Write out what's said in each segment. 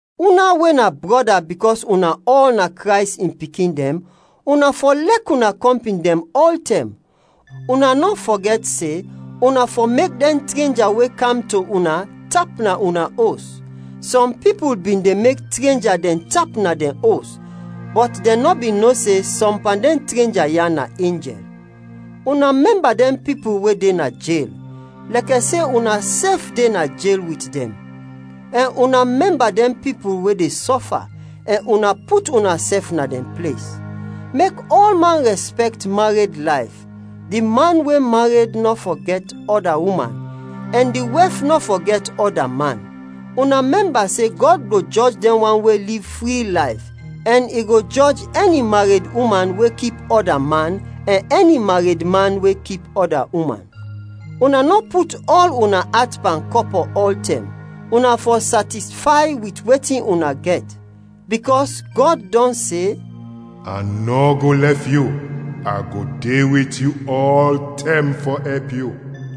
Una we na brɔda bikɔs una ɔl na Krays in pikin dɛn, una fɔ lɛk una kɔmpin dɛn ɔltɛm. Una nɔ fɔgɛt se, una fɔ mek dɛn trenja we kam to una tap na una os. Sɔm pipul bin de mek trenja dɛn tap na dɛn os, bɔt dɛn nɔ bin no se sɔm pan dɛn trenja ya na enjɛl. Una mɛmba dɛn pipul we de na jel, lɛkɛ se unasɛf de na jel wit dɛn; ɛn una mɛmba dɛn pipul we de sɔfa, ɛn una put unasɛf na dɛn ples. Mek ɔlman rɛspɛkt mared layf, di man we mared nɔ fɔ gɛt ɔda uman ɛn di wɛf nɔ fɔ gɛt ɔda man. Una mɛmba se Gɔd go jɔj dɛn wan we liv fri layf, ɛn i go jɔj ɛni mared uman we kip ɔda man ɛn ɛni mared man we kip ɔda uman. Una nɔ put ɔl una at pan kɔpɔ ɔltɛm, una fɔ satisfay wit wetin una gɛt, bikɔs Gɔd dɔn se, “A nɔ go lɛf yu, a go de wit yu ɔltɛm fɔ ɛp yu.”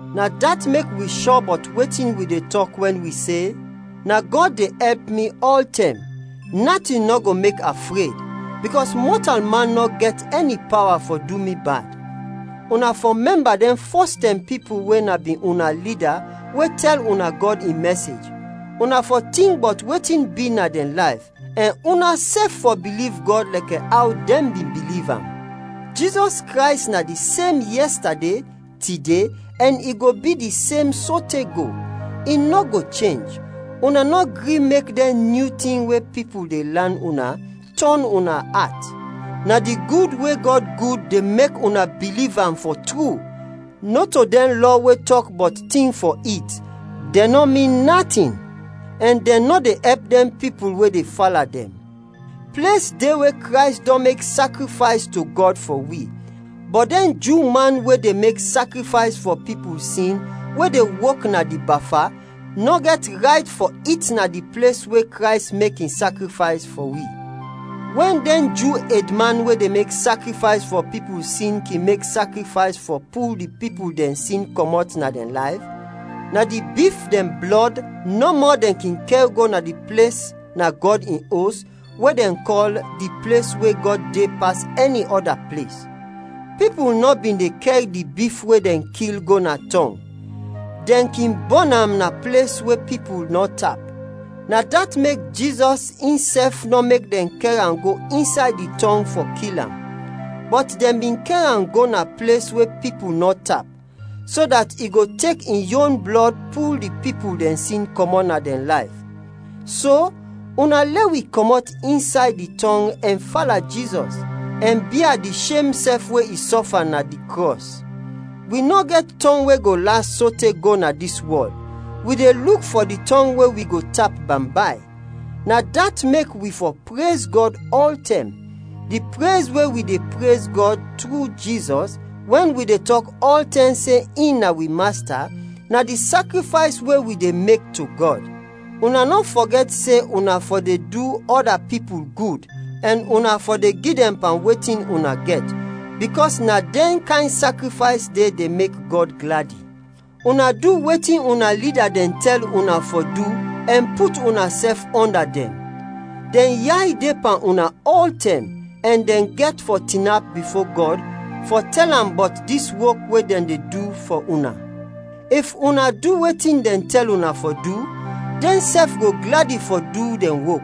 Na dat mek wi shɔ bɔt wetin wi de tɔk wɛn wi se, “Na Gɔd de ɛp mi ɔltɛm, natin nɔ go mek a fred, bikɔs mɔtalman nɔ gɛt ɛni pawa fɔ du mi bad.” Una fɔ mɛmba dɛn fɔstɛm pipul we na bin una lida we tɛl una Gɔd in mɛsej. Una fɔ tink bɔt wetin bi na dɛn layf, ɛn unasɛf fɔ biliv Gɔd lɛkɛ aw dɛn bin biliv am. Jizɔs Krays na di sem yɛstade, tide, ɛn i go bi di sem sote go, i nɔ go chenj. Una nɔ gri mek dɛn nyu tin we pipul de lan una, tɔn una at. Na di gud we Gɔd gud de mek una biliv am, fɔ tru, nɔto dɛn lɔ we tɔk bɔt tin fɔ it; dɛn nɔ min natin, ɛn dɛn nɔ de ɛp dɛn pipul we de fala dɛn. Ples de we Krays dɔn mek sakrifays to Gɔd fɔ wi, bɔt dɛn Ju man we de mek sakrifays fɔ pipul sin we de wok na di Bafa, nɔ gɛt rayt fɔ it na di ples we Krays mek in sakrifays fɔ wi. Wɛn dɛn Ju edman we de mek sakrifays fɔ pipul sin kin mek sakrifays fɔ pul di pipul dɛn sin kɔmɔt na dɛn layf, na di bif dɛn blɔd nɔmɔ dɛn kin kɛr go na di ples na Gɔd in Os we dɛn kɔl “Di ples we Gɔd de pas ɛni ɔda ples.” Pipul nɔ bin de kɛr di bif we dɛn kil go na tɔng, dɛn kin bɔn am na ples we pipul nɔ tap. Na dat mek Jizɔs insɛf nɔ mek dɛn kɛr am go insay di tɔng fɔ kil am, bɔt dɛn bin kɛr am go na ples we pipul nɔ tap, so dat i go tek in yon blɔd pul di pipul dɛn sin kɔmɔt na dɛn layf. So, una lɛ wi kɔmɔt insay di tɔng ɛn fala Jizɔs, ɛn bia di shem sɛf we i sɔfa na di krɔs. Wi nɔ gɛt tɔng we go las sote go na dis wɔl; wi de luk fɔ di tɔng we wi go tap bambay. Na dat mek wi fɔ prez Gɔd ɔltɛm; di prez we wi de prez Gɔd tru Jizɔs, wɛn wi de tɔk ɔltɛm se in na wi Masta, na di sakrifays we wi de mek to Gɔd. Una nɔ fɔgɛt se una fɔ de du ɔda pipul gud, ɛn una fɔ de gi dɛn pan wetin una gɛt, bikɔs na dɛn kayn sakrifays de, de mek Gɔd gladi. Una du wetin una lida dɛn tɛl una fɔ du ɛn put unasɛf ɔnda dɛn. Dɛn yay de pan una ɔltɛm ɛn dɛn gɛt fɔ tinap bifo Gɔd fɔ tɛl am bɔt dis wok we dɛn de du fɔ una. If una du wetin dɛn tɛl una fɔ du, dɛnsɛf go gladi fɔ du dɛn wok.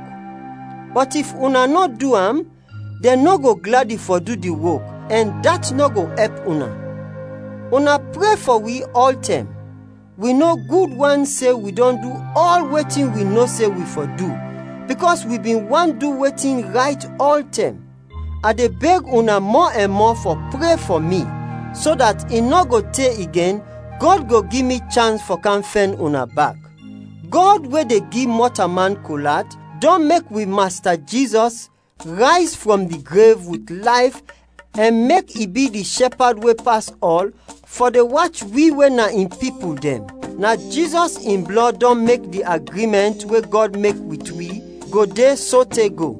Bɔt if una nɔ du am, dɛn nɔ go gladi fɔ du di wok, ɛn dat nɔ go ɛp una. Una pre fɔ wi ɔltɛm. Wi no gud wan se wi dɔn du ɔl wetin wi no se wi fɔ du, bikɔs wi bin want du wetin rayt ɔltɛm. A de beg una mɔ ɛn mɔ fɔ pre fɔ mi, so dat i nɔ go te igen Gɔd go gi mi chans fɔ kam fɛn una bak. Gɔd we de gi mɔtalman kol at, dɔn mek wi Masta Jizɔs rayz frɔm di grev wit layf ɛn mek i bi di shɛpad we pas ɔl fɔ de wach wi we na in pipul dɛn. Na Jizɔs in blɔd dɔn mek di agrimɛnt, we Gɔd mek wit wi, go de sote go.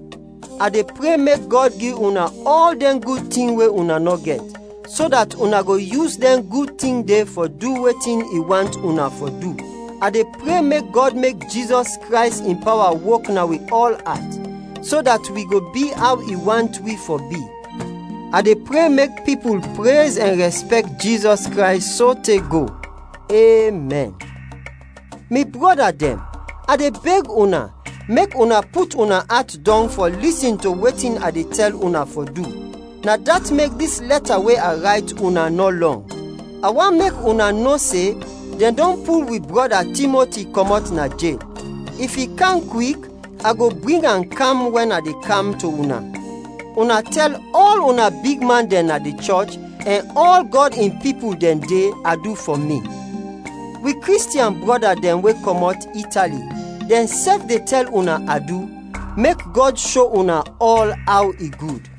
A de pre mek Gɔd gi una ɔl dɛn gud tin we una nɔ gɛt, so dat una go yus dɛn gud tin de fɔ du wetin i want una fɔ du. A de pre mek Gɔd mek Jizɔs Krays in pawa wok na wi ɔl at, so dat wi go bi aw i want wi fɔ bi. A de pre mek pipul prez ɛn rɛspɛkt Jizɔs Krays sote go! Emɛn. Mi brɔda dɛn, a de beg una, mek una put una at dɔng fɔ lisin to wetin a de tɛl una fɔ du; na dat mek dis lɛta we a rayt una nɔ lɔng. A want mek una no se dɛn dɔn pul wi brɔda Timoti kɔmɔt na jel. If i kam kwik, a go bring am kam wɛn a de kam to una. Una tɛl ɔl una bigman dɛn na di chɔch ɛn ɔl Gɔd in pipul dɛn de, adu fɔ mi. Wi Kristiɛn brɔda dɛn we kɔmɔt Itali, dɛnsɛf de tɛl una adu. Mek Gɔd sho una ɔl aw i gud.